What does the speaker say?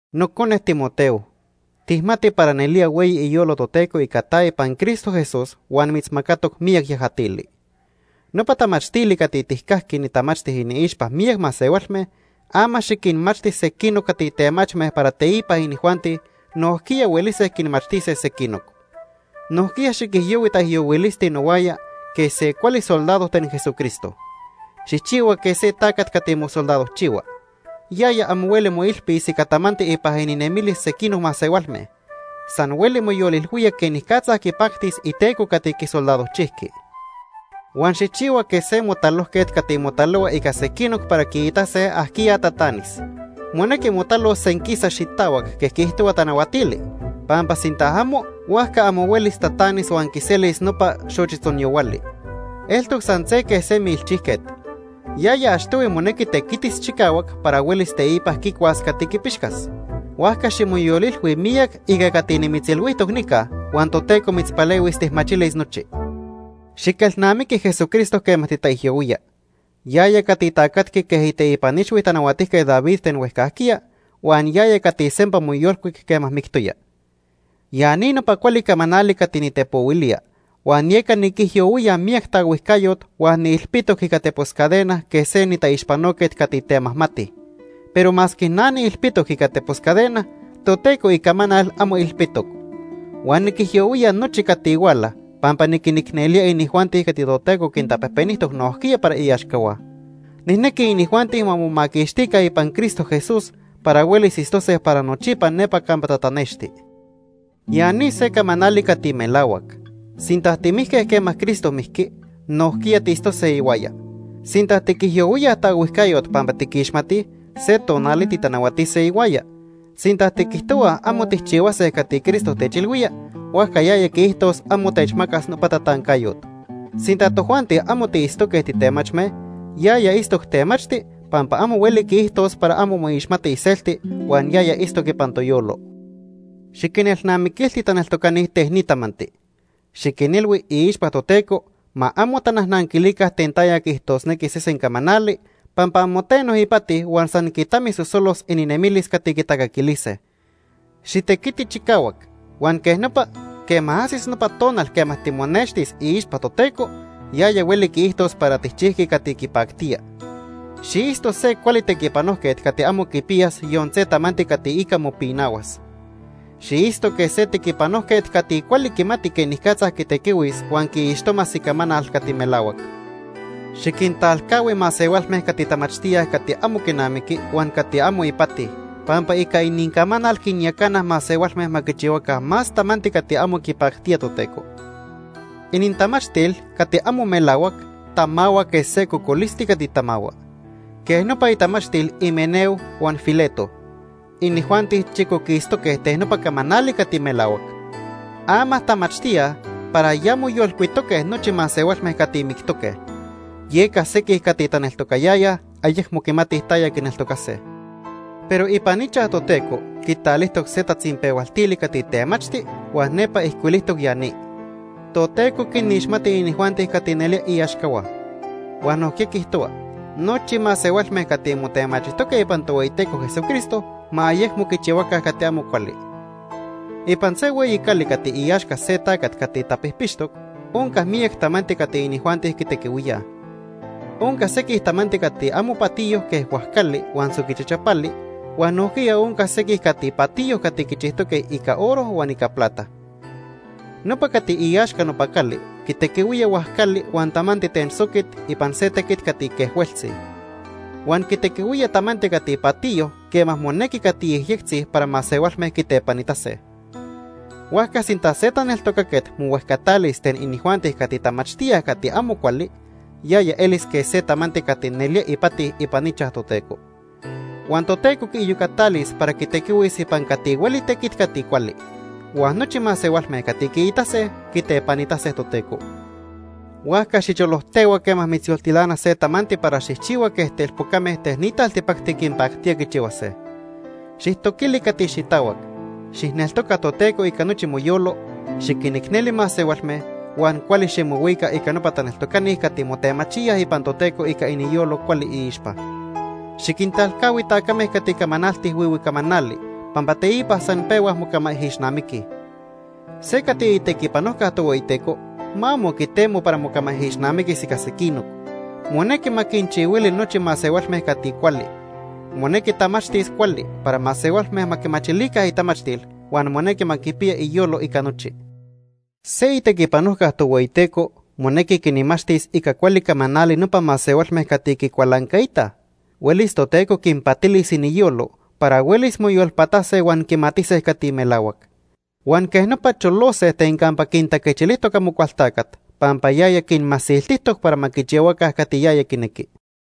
Nocone Timoteo, tijmati para nelía hueyi iyolo Toteco ica ta ipan Cristo Jesús huan mitzmacatoc miyac yajatili. Nopa tamachtili cati tijcajqui nitamachti iniixpa miyac masehualme, ama xiquinmachti sequinoc cati temachme para teipa inijuanti nojquiya huelise quinmachtise sequinoc. Nojquiya xiquijyohui taijyohuilisti nohuaya quej se cuali soldado ten Jesucristo. Xijchihua quej se tacat cati mosoldadojchihua. Yaya amo hueli moilpis ica tamanti ipan ininemilis sequinoc masehualme. San hueli moyolilhuía quenicatza quipactis iteco cati quisoldadojchijqui. Huan xijchihua quej se motalojquet cati motalohua ica sequinoc para quiitase ajquiya tatanis. Monequi motalos senquisa xitahuac quej quiijtohua tanahuatili, pampa sinta amo, huajca amo huelis tatanis huan quiselis nopa xochitzonyahuali. Eltoc san se quej se milchijquet. Yaya achtohui monequi tequitis chicahuac para huelis teipa quicuas cati quipixcas. Huajca ximoyolilhui miyac ica cati nimitzilhuijtoc nica huan Toteco mitzpalehuis tijmachilis nochi. Xiquelnamiqui Jesucristo quema titaijyohuía. Yaya cati tacatqui quej iteipan ixhui Tanahuatijquet David ten huejcajquiya huan yaya cati sempa moyolcuic quema mictoya. Ya ni nopa cuali camanali cati nitepohuilía, huan yeca niquijyohuía miyac taohuijcayot huan niilpitoc ica tepos cadena quej se nitaixpanoquet cati temajmati. Pero masque na niilpitoc ica tepos cadena, Toteco icamanal amo ilpitoc. Huan niquijyohuía nochi cati huala pampa niquinicnelía inijuanti cati Toteco quintapejpenijtoc nojquiya para iaxcahua. Nijnequi inijuanti ma momaquixtica ipan Cristo Jesús para huelis itztose para nochipa nepa campa tatanexti. Ya ni se camanali cati melahuac: Sinta timijque quema Cristo mijqui, nojquiya tiitztose ihuaya. Sinta tiquijyohuíaj taohuijcayot pampa tiquixmatij, se tonali titanahuatise ihuaya. Sinta tiquijtohuaj amo tijchihuase cati Cristo techilhuía, huajca yaya quiijtos amo techmacas nopa tatancayot. Sinta tojuanti amo tiitztoque titemachme, yaya itztoc temachti pampa amo hueli quiijtos para amo moixmati iselti huan yaya itztoc ipan toyolo. Xiquinelnamiquilti taneltocani ten ni tamanti. Xiquinilhui iixpa Toteco ma amo tanajnanquilica ten taya quiijtosnequi sesen camanali, pampa amo teno ipati huan san quitamisosolos ininemilis cati quitacaquilise. Xitequiti chicahuac, huan quej nopa, quema ajsis nopa tonal quema timonextis iixpa Toteco, yaya hueli quiijtos para tijchijqui cati quipactía. Xiitzto se cuali tequipanojquet cati amo quipiyas yon se tamanti cati ica mopinahuas. Xiitzto quej se tequipanojquet cati cuali quimati quenicatza quitequihuis huan quiixtomas Icamanal cati melahuac. Xiquintalcahui masehualme cati tamachtíaj cati amo quinamiqui huan cati amo ipati, pampa ica inincamanal quinyacanaj masehualme ma quichihuaca más tamanti cati amo quipactía Toteco. Inintamachtil cati amo melahuac tamahua quej se cocolisti cati tamahua. Quej nopa itamachtil Himeneo huan Fileto. Inijuanti chicoquistoque ten nopa camanali cati melahuac. Ama tamachtíaj para ya moyolcuitoque nochi masehualme cati mictoque cati moyolcuise. Yeca sequij cati taneltocayayaj ayecmo quimatij taya quineltocase. Pero ipan ichaj Toteco quitalijtoc se tatzinpehualtili cati temachti huan nepa ijcuilijtoc ya ni: “Toteco quinixmati inijuanti cati nelía iaxcahua”; huan nojquiya quiijtohua: “Nochi masehualme cati motemachijtoque ipan Tohueyiteco Jesucristo ma ayecmo quichihuaca cati amo cuali.” Ipan se hueyi cali cati iaxca se tacat cati tapijpixtoc onca miyac tamanti cati inijuanti quitequihuíaj. Onca sequij tamanti cati amo patiyo quej huajcali huan soqui chachapali, huan nojquiya onca sequij cati patiyo cati quichijtoque ica oro huan ica plata. Nopa cati iaxca nopa cali quitequihuía huajcali huan tamanti ten soquit ipan se tequit cati quejhueltzi. Huan quitequihuía tamanti cati patiyo quema monequi cati yejyectzi para masehualme quitepanitase. Huajca sinta se taneltocaquet mohuejcatalis ten inijuanti cati tamachtíaj cati amo cuali, yaya elis quej se tamanti cati nelía ipati ipan ichaj Toteco. Huan Toteco quiiyocatalis para quitequihuis ipan cati hueli tequit cati cuali. Huan nochi masehualme cati quiitase, quitepanitase Toteco. Huajca xicholojtehua quema mitzyoltilana se tamanti para xijchihua quej telpocame ten ni taltipacti quinpactía quichihuase. Xijtoquili cati xitahuac. Xijneltoca Toteco ica nochi moyolo, xiquinicneli masehualme huan cuali ximohuica ica nopa taneltocani cati motemachíaj ipan Toteco ica iniyolo cuali iixpa. Xiquintalcahui tacame cati camanaltij huihui camanali pampa teipa san pehuaj mocamaijixnamiquij. Se cati itequipanojca Tohueyiteco ma amo quitemo para mocamaijixnamiquis ica sequinoc. Monequi ma quinchihuili nochi masehualme cati cuali. Monequi tamachtis cuali para masehualme ma quimachilica itamachtil huan monequi ma quipiya iyolo ica nochi. Se itequipanojca Tohueyiteco monequi quinmachtis ica cuali camanali nopa masehualme cati quicualancaitaj. Huelis Toteco quinpatilis iniyolo para huelis moyolpatase huan quimatise cati melahuac. Huan quej nopa, cholose ten campa quintaquechilijtoc Amocualtacat, pampa yaya quinmasiltijtoc para ma quichihuaca cati yaya quinequi.